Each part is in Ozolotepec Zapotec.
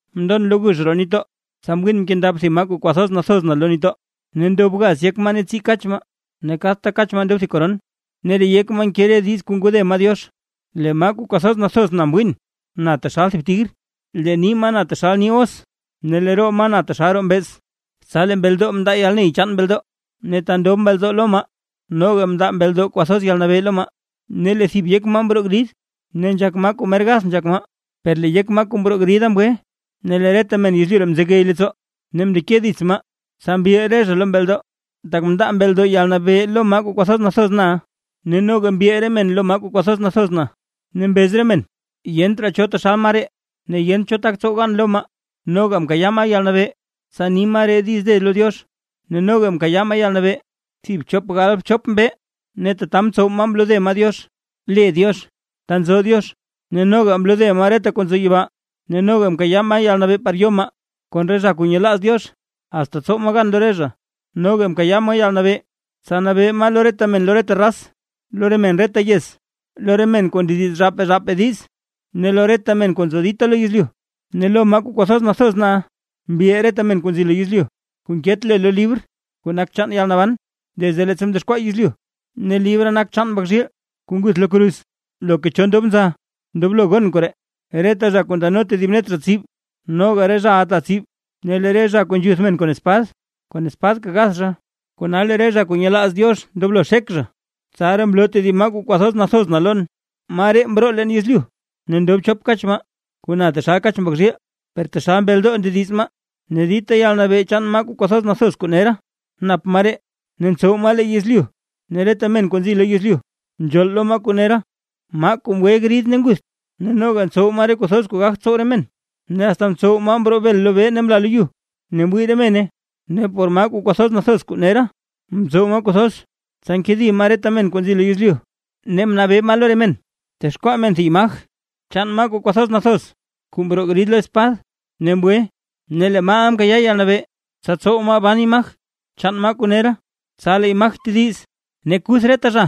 Mndon lo gux roo nitdoo, tsa mwiin mkendab thib maa kuu kwathoz nathoz na lo nitdoo, ne ndob gaz yek maa ne tsii kach maa. Ne kadta kach maa ndob thib koron, ne re yek maa nke diiz kuu ngode maa Diox. Lee maa kuu kwathoz nathoz na mwin, na taxal thib tigr, lee nii maa na taxal nii os ne lee roo maa na taxal roo mbeez. Tsa lee mbeldoo mndaa yalney chaan mbeldoo ne ta ndob mbeldoo lo maa, noga mndaa mbeldoo kwathoz yalnabee lo maa. Ne lee thib yek maa mroo grid, ne nzhak maa kuu mer gath nzhak maa; per lee yek maa kuu mroo grida mgwe. Ne lee reta men yezlyu mzegey leettsoo ne mndeke dits maa. Tsa mbil re zha lo mbeldoo, tak mndaa mbeldoo yalnabee lo maa kuu kwathoz nathoz na, ne noga mbil re men lo maa kuu kwathoz nathoz na, ne mbez re men: ―Yent raa cho taxal maa ree ne yent cho tak tsow gan lo maa. Noga mkayaa maa yalnabee, tsa ni maa re diiz de lo Diox, ne noga mkayaa maa yalnabee thib chop gal bchop mbee. Ne tata mtsow maa mlode maa Diox, le Diox, ta nzo Diox, ne noga mlode maa reta zha kuu nzo yibaa. Ne mkayaa maa yalnabee par yo maa kon re zha kuu nyelaaz Diox, asta tsow maa gan lo re zha; noga mkayaa maa yalnabee tsa nabee maa lo re men reta raz, lo re men reta yez, lo re men kuu ndediz zhaapaa zhaapaa diiz ne lo reta men kuu nzo dita lo yezlyu. Ne lo maa kuu kwathoz nathoz na, mbil reta men kuu nzi lo yezlyu, kuu nket le lo libr kuu nak chaan yalnaban, desde leettsa mdexkwaa yezlyu, ne libra nak libr chaan Mbak zhiil kuu nguth lo kruz. Loka cho ndob nza ndoblo gon koree: Reta zha kuu ndano tedib net zha tsib, noga re zhaʼa ta tsib; ne lee re zha kuu nzhuth men kon espad, kon espadka gath zha. Kona lee re zha kuu nyelaaz Diox ndoblo xek zha. Tsaraa mloo tedib maa kuu kwathoz nathoz na lon, maa ree mroo leen yezlyu. Ne ndob chop kach maa, kuu na taxal kach mbak zhiil, per taxal mbeldoo ndediz maa. Ne dita yalnabee chaan maa kuu kwathoz nathoz kuu nera nap maa ree, ne ntsow maa lee yezlyu ne reta men kuu nzi lo yezlyu nzhool lo maa kuu nera, maa kuu mgwe grid ne ngutht. Ne noga ntsow maa re kuu thoz kuu gagt tsow re men, ne asta mtsow maa mroo bel lobee mla lo yu, ne mwii re mene. Ne por maa kuu kwathoz nathoz kuu nera, ntsow maa kuu thoz, tsa nkedi maa reta men kuu nzi lo yezlyu, ne mnabee maa lo re men texkwaa re men thib imaj chaan maa kuu kwathoz nathoz kuu mroo grid lo espad ne mgwe. Ne lee maaʼa mkayaa yalnabee, tsa tsow maa ban imaj chaan maa kuu nera, tsa lee imaj tediz ne kuth reta zha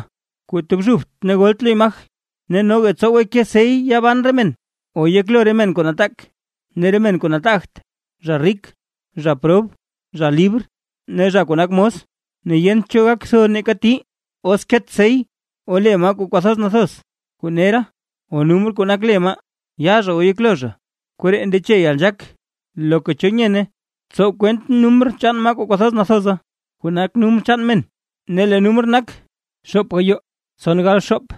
kuu tobxubt ne golt lo imaj. Ne noga ntsowe ke sey yaa ban re men o yeklo re men kuu nataak ne re men kuu nataagt, zha rik, zha prob, zha libr ne zha kuu nak mos. Ne yent cho gak tho neeka tii, os nket sey o le maa kuu kwathoz nathoz kuu nera o numr kuu nak le maa, yaa zha o yeklo zha. Koree ndeche yalnzhaak; loka cho nyene, tsow kwent numr chaan maa kuu kwathoz nathoza, kuu nak numr chaan men. Ne lee numr nak, xoop gayoo tson gal xoop.